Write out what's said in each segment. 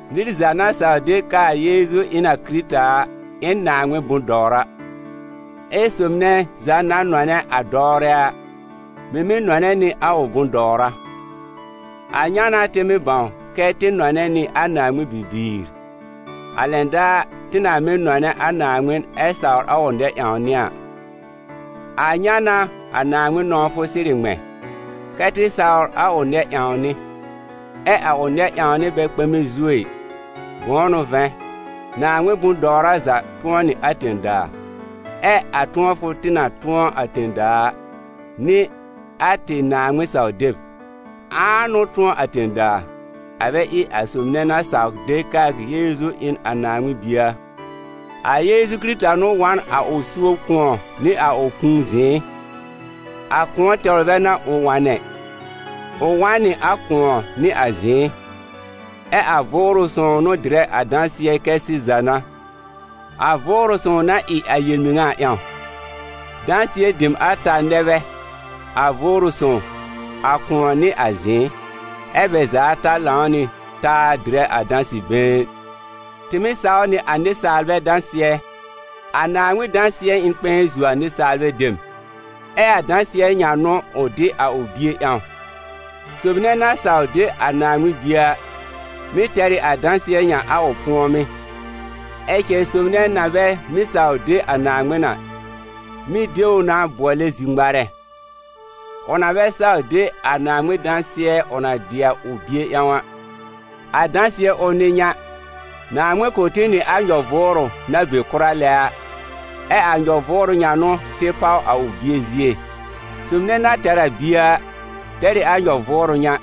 Nɩr za na saw de k'aa Yeezu ɩ n a Kɩrɩta a, ɩ n Naaŋmɩn bʋ̃-dɔwra. Ɛ sob nɛ za na nɔnɛ a dɔwrɛ a, mɩ̀ mɩ́ nɔnɛ nɩ a ʋ bʋ̃-dɔwra. A ŋa n'a tɩ mɩ́ bãw kɛ tɩ nɔnɛ nɩ a Naaŋmɩn bibiir: a lɛn daar tɩ na mɩ́ nɔnɛ a Naaŋmɩn ɛ sawr a ʋ nɛ-ƴãwnɩ a. A ŋa n'a a Naaŋmɩn nɔ̃wfʋ sɩrɩ ŋmɛ̃: kɛ́ tɩ sawr a ʋ nɛ-ƴãwnɩ. Ɛ a ʋ nɛ-ƴãwnɩ bɛ kpɛmɛ zuo ɩ, bʋ̃ʋ n'ʋ vɛ̃, Naaŋmɩn bʋ̃-dɔwra za tʋ̃ɔ nɩ a tẽ-daa, ɛ a tʋ̃ɔfʋ tɩ na tʋ̃ɔ a tẽ-daa a, n'ɩ a tɩ Naaŋmɩn-saw-deb. Ãa n'ʋ tʋ̃ɔ a tẽ-daa, a bɛ ɩ a sob nɛ na saw de k'aa Yeezu ɩ n a Naaŋmɩn Bie a? A Yeezu Kɩrɩta n'ʋ wa n a ʋ suob kʋ̃ɔ nɩ a ʋ kũu zɩ̃ɩ. A kʋ̃ɔ tɛwr bɛ n'a ʋ wa n ɛ, ʋ wa n nɩ a kʋ̃ɔ nɩ a zɩ̃ɩ. Ɛ a Vʋʋrʋ sõw n'ʋ dɩrɛ a dãsɩɛ kɛ sɩza n'a, a Vʋʋrʋ Sõw na ɩ a yel-mɩŋa a ƴãw. Dãsɩɛ dem ata nɛ bɛ: a Vʋʋrʋ Sõw, a kʋ̃ɔ nɩ a zɩ̃ɩ, ɛ bɛ za ata lãw nɩ taa dɩrɛ a dãsɩ-been. Tɩ mɩ́ saw nɩ a nɩsaalbɛ dãsɩɛ, a Naaŋmɩn dãsɩɛ ɩ n kpɛ̃ɛ zuo a nɩsaalbɛ dem. Ɛ a dãsɩɛ ŋa n'ʋ ʋ dɩ a ʋ Bie ƴãw. Sob nɛ na saw de a Naaŋmɩn Bie a, mɩ̀ tɛr ɩ a dãsɩɛ ŋa a ʋ pʋ̀ɔmɩ́. Ɛ cɛ sob nɛ na bɛ mɩ́ saw de a Naaŋmɩn a, mɩ́ de ʋ na bʋɔlɛ zir-ŋmarɛ, ʋ na bɛ saw de a Naaŋmɩn dãsɩɛ ʋ na dɩ a ʋ Bie ƴãw a. A dãsɩɛ ʋl n'ɩ ŋa: Naaŋmɩn kʋ̀ tɩ nɩ a nyɔ-vʋʋrʋ na be kʋra lɛ a, ɛ a nyɔ-vʋʋrʋ ŋa n'ʋ tɩ páw a ʋ Bie zie. Sob nɛ na tɛr a Bie a, tɛr ɩ a nyɔ-vʋʋrʋ ŋa,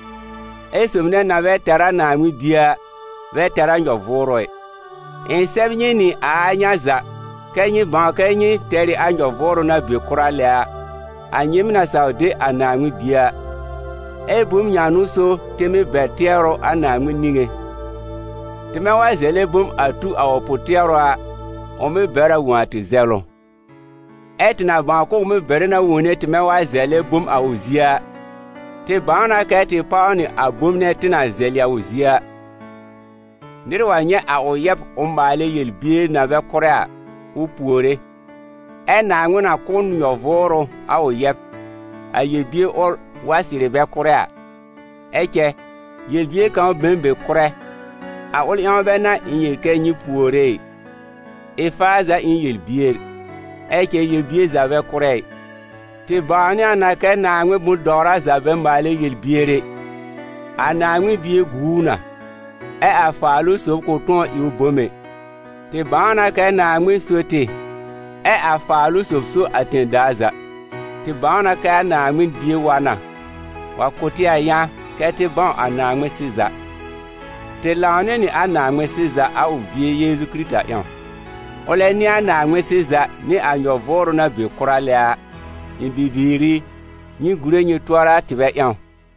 ɛ sob nɛ na bɛ tɛr a Naaŋmɩn Bie a, bɛ tɛr a nyɔ-vʋʋrʋ ɛ. Ɩ̃ sɛb nyɩ nɩ a a ŋa za kɛ́ nyɩ bãw kɛ nyɩ tɛr ɩ a nyɔ-vʋʋrʋ na be kʋra lɛ a, a nyɩɩm na saw de a Naaŋmɩn Bie a. Ɛ bom ŋa n'ʋ so tɩ mɩ́ bɛr tɩɛrʋ a Naaŋmɩn niŋé: tɩmɛ wa zɛlɛ bom a tu a ʋ pʋ-tɩɛrʋ a, ʋ mɩ́ bɛr a wõ a tɩ zɛlʋ. Ɛ tɩ na bãw k'ʋʋ mɩ́ bɛrɛ na wone tɩmɛ wa zɛlɛ bom a ʋ zie a, tɩ bãw na kɛ tɩ páw nɩ a bom nɛ tɩ na zɛlɩ a ʋ zie a. Nɩr wa nyɛ̃ a ʋ yɛb ʋ maalɛ yel-bier na bɛ kʋ́rɛ a, ʋ puore, ɛ Naaŋmɩn na kʋ̀ n nyɔ-vʋʋrʋ a ʋ yɛb, a yel-bier ʋl wa sɩrɩ bɛ kʋ́rɛ a. Ɛ cɛ, yel-bier kãw be n be kʋ́rɛ. A ʋl ƴãw bɛ n'a ɩ̃ yel kɛ nyɩ puore ɩ. Ɩ-faa za ɩ n yel-bier, ɛ cɛ yel-bier za bɛ kʋ́rɛ ɩ. Tɩ bãwnɩ a na kɛ Naaŋmɩn bʋ̃-dɔwra za bɛ maalɛ yel-bier ɛ, a Naaŋmɩn Bie gu ʋ na, ɛ a Faalʋ-sob kʋ̃ tʋ̃ɔ ɩ ʋ bom ɛ. Tɩ bãw na kɛ Naaŋmɩn so tɩ, ɛ a Faalʋ-sob so a tẽ-daa za. Tɩ bãw na kɛ a Naaŋmɩn Bie wa na, wa kʋ̀ tɩ a yã kɛ́ tɩ bãw a Naaŋmɩn-sɩza. Tɩ lãw nɩ nɩ a Naaŋmɩn-sɩza a ʋ Bie Yeezu Kɩrɩta ƴãw. Ʋlɛ n'ɩ a Naaŋmɩn-sɩza nɩ a nyɔ-vʋʋrʋ na be kʋra lɛ a. Ɩ̃ bibiir i, nyɩ gùre nyɩ tʋɔra a tɩbɛ ƴãw.